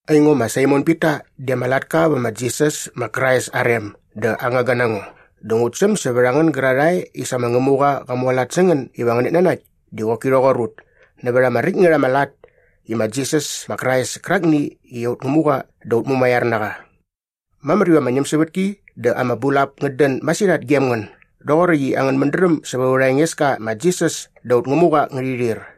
Aingo ma Saimon Pita di ama latka vä ma Jisas ma Krais aa rem dä aa ngangga na ngo dä ngut säm sävät a ngän gärarhae i sa ma Ngämuqa qa mualat sä ngän iva ngänät nanakt di qoki rhoqor ut nävät ama räkt ngät ama lat i ma Jisas ma Krais kärakni i aut Ngämuqa dä aut mumaiar na qa. Mamär iva ama ñämsävätki dä ama bulap ngät dän masirhat gem ngän doqoräkt i angän mädräm sävät aurha Engeska ma Jisas dä aut Ngämuqa ngärhi rhir.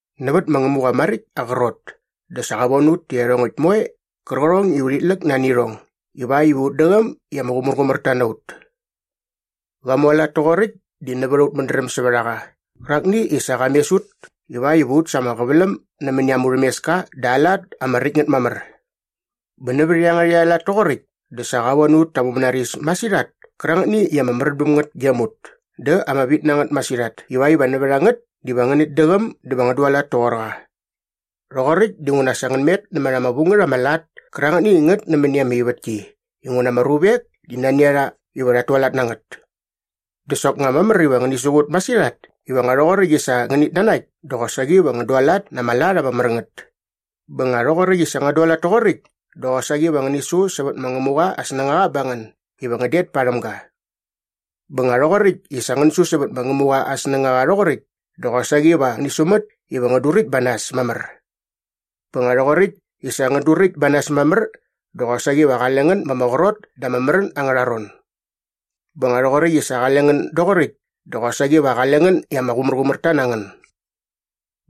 Nävät ma Ngämuqa maräkt aa qrot di sa qa von ut tä iarhongäkt moe qärqärhong i urhit läk nani irhong ivakt iva ut däqäm i ama qumärqumärta na ut. Qa mualat toqoräkt di nävät aut mädräm sävät a qa qärakni i sa qa mes ut ivakt iva ut sa ama qäväläm nämäni aa murhämeska dä aa lat ama räkt ngät mamär. Bä nävät iangärhäkt aa lat toqoräkt dä sa qa von ut ta aa mumänaris masirhat kärangätni i ama märän bäm ngät gem ut dä ama vit na ngät masirhat ivakt iva nävät a ngät diva ngänät däqäm dä va ngän dualat toqor qa. Rhoqoräkt dinguna sa ngän met nämät ama vu ngät ama lat kärangätni i ngät nämäni ama ivätki inguna ama ruvek di nani a rha iva rhat tualat na ngät. Dä soknga mamär iva ngäni siqut masirhat iva nga rhoqoräkt i sa ngänät nanakt dä qosaqi va ngän dualat na ama lat ama mär ngät. Bä nga rhoqoräkt i sa ngän dualat toqoräkt dä qosaqi va ngäni su sävät ma Ngämuqa aa snängaqa ba ngän iva ngän det parhäm ga. Bä nga rhoqoräkt i sa ngän su sävät ma Ngämuqa aa snängaqa rhoqoräkt dä qosaqi va ngäni sumät iva ngän duräkt ba nas mamär. Bä nga rhoqoräkt i sa ngän duräkt ba nas mamär dä qosaqi va qale ngän ma ama qrot da ama märän angärha ron. Bä nga rhoqoräkt i sa qale ngän doqoräkt dä qosaqi va qale ngän i ama qumärqumärta na ngän.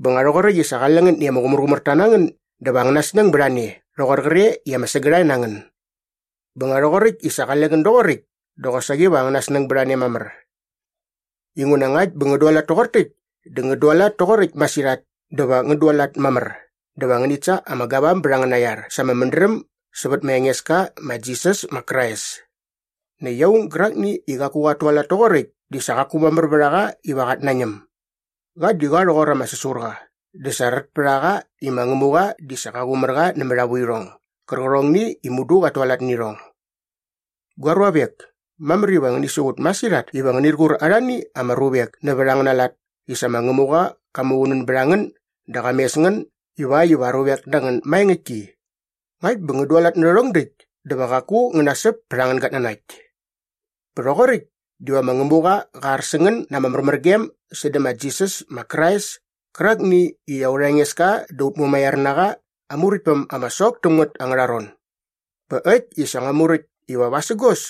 Bä nga rhoqoräkt i sa qale ngän i ama qumärqumärta na ngän dä va angäna snäng bät a ne rhoqor qre i ama sägärhae na ngän. Bä nga rhoqoräkt i sa qale ngän doqoräkt dä qosaqi va angäna snäng bät a ne mamär. Inguna ngakt bä ngän dualat toqor täkt dä ngän dualat toqoräkt masirhat dä va ngän dualat mamär dä va ngänit sa ama gavam bät angäna iar sa ama mädräm sävät ma Engeska ma Jisas ma Krais. Näkt aung gärakni i qaku qat tualat toqoräkt di sa qaku mamär vät a qa iva qat nañäm. Qa di qa rhoqor ama säsurqa dä sa rät pät a qa i ma Ngämuqa di sa qa qumär qa nämät aa vuirhong gärqärhongni i mudu qat tualat nä irhong. Gua ruavek, mamär iva ngäni siqut masirhat iva ngänir qur arhani ama ruvek nävät angäna lat i sa ma Ngämuqa qa muqunän bät a ngän dä qa mes ngän ivakt iva aa ruvek na ngän maengäktki. Ngakt bä ngän dualat nä rhärhong däkt dä va qaku ngän nasäp pät angän gatnanakt. Bä rhoqoräkt diva ma Ngämuqa qä ar sä ngän na ama märmärgem sädä ma Jisas ma Krais kärakni i aurha Engeska dä aut mumaiar na qa aa Muräktpäm ama sok täm ngät angärha ron. Bä äkt i sa ngua muräkt iva vasägos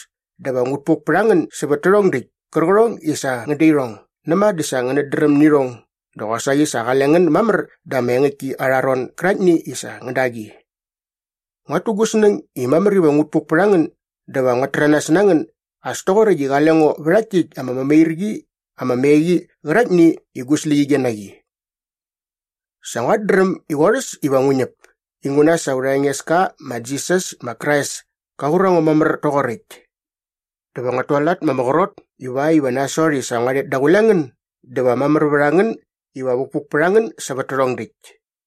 dä va ngut puk pät a ngän sävät tärhong däkt kärqärhong i sa ngän da irhong näma dä sa ngänät dräm nä irhong dä qosaqi sa qale ngän mamär da ama engäktki arha ron gäraktni i sa ngän da qi. Nguat tu gu snäng i mamär iva ngut puk pät a ngän dä va nguat täranas na ngän as toqoräkt i qale ngo vä rhakt täkt ama mämairqi ama me qi qäraktni i gu släqyige na qi. Sa nguat dräm i qorhäs iva ngu ñäp inguna sa aurha Engeska ma Jisas ma Krais ka qur a ngo mamär toqoräkt. Dä va nguat tualat ma ama qrot ivakt iva nasot i sa ngua rhet daqule ngän dä va mamär vät a ngän iva vukpuk pät a ngän sävät tärhong däkt.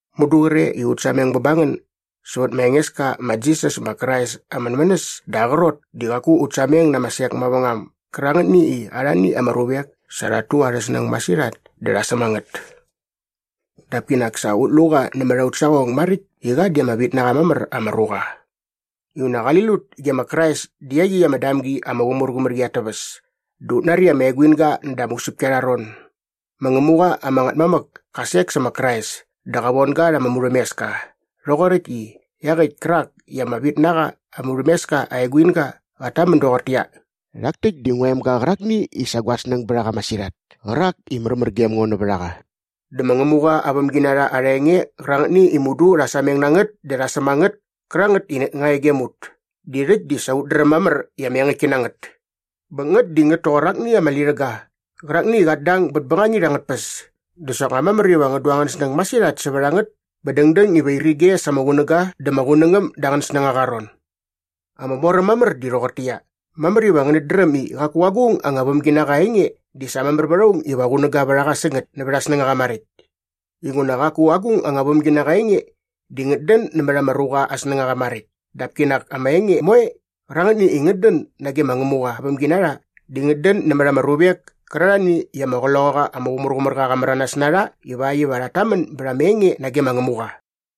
Mudu qre i ut sameng bä ba ngän sävät ma Engeska ma Jisas ma Krais aa mänmänäs dä aa qrot di qaku ut sameng na ama sek mavängam gärangätni i arhani ama ruvek sa rhat tu arhä snäng masirhat dä rha säm a ngät. Dap kinak sa ut lu qa nämät aut saqong maräkt i qa di ama vit na qa mamär ama ruqa. Inguna qali lut ge ma Krais dä iaqyäkt ama damgi ama qumärqumär qi at täväs dä ut nari ama eguinga näda ama usäpki arha ron. Ma Ngämuqa ama Ngätmamäk ka sek sä ma Krais dä qa von ga rha ama murhämeska rhoqoräkt i iaqäkt kärak i ama vit na qa aa murhämeska aa eguinga qat tamän doqortäqyia, “Rhak täkt di ngua emga qärakni i sa gua snäng bät a qa masirhat kärak i märmär gem ngo nävät a qa.” Dä ma Ngämuqa aa vämginarha arha enge qärangätni i mudu rha sameng na ngät dä rha säm a ngät kärangät i nga e gem ut di rhäkt di sa ut dräm mamär i ama engäktki na ngät. Bä ngät di ngät toqor akni ama lirhäga qärakni i qat dang bät bängangit angät tpäs dä soknga mamär iva ngän du angän snäng masirhat sävät a ngät bä dängdäng iva irige sa ama qunäga dä ma Qunängäm da angän snängaqa aa ron. Ama moräm mamär di rhoqortäqyia, mamär iva ngänät dräm i qaku agung anga vämginaqa aa enge di sa mamär vät aung iva qunäga vät a qa sä ngät nävät aa snängaqa maräkt inguna qaku agung anga vämginaqa aa enge di ngät dän nämät ama ruqa aa snängaqa maräkt dap kinak ama enge moe qärangätni i ngät dän nage ma Ngämuqa aa vämginarha di ngät dän nämät ama ruvek kärarhani i ama Qloqaqa ama Qumärqumärqa qa märanas na rha ivakt iva rhat tamän bät ama enge nage ma Ngämuqa.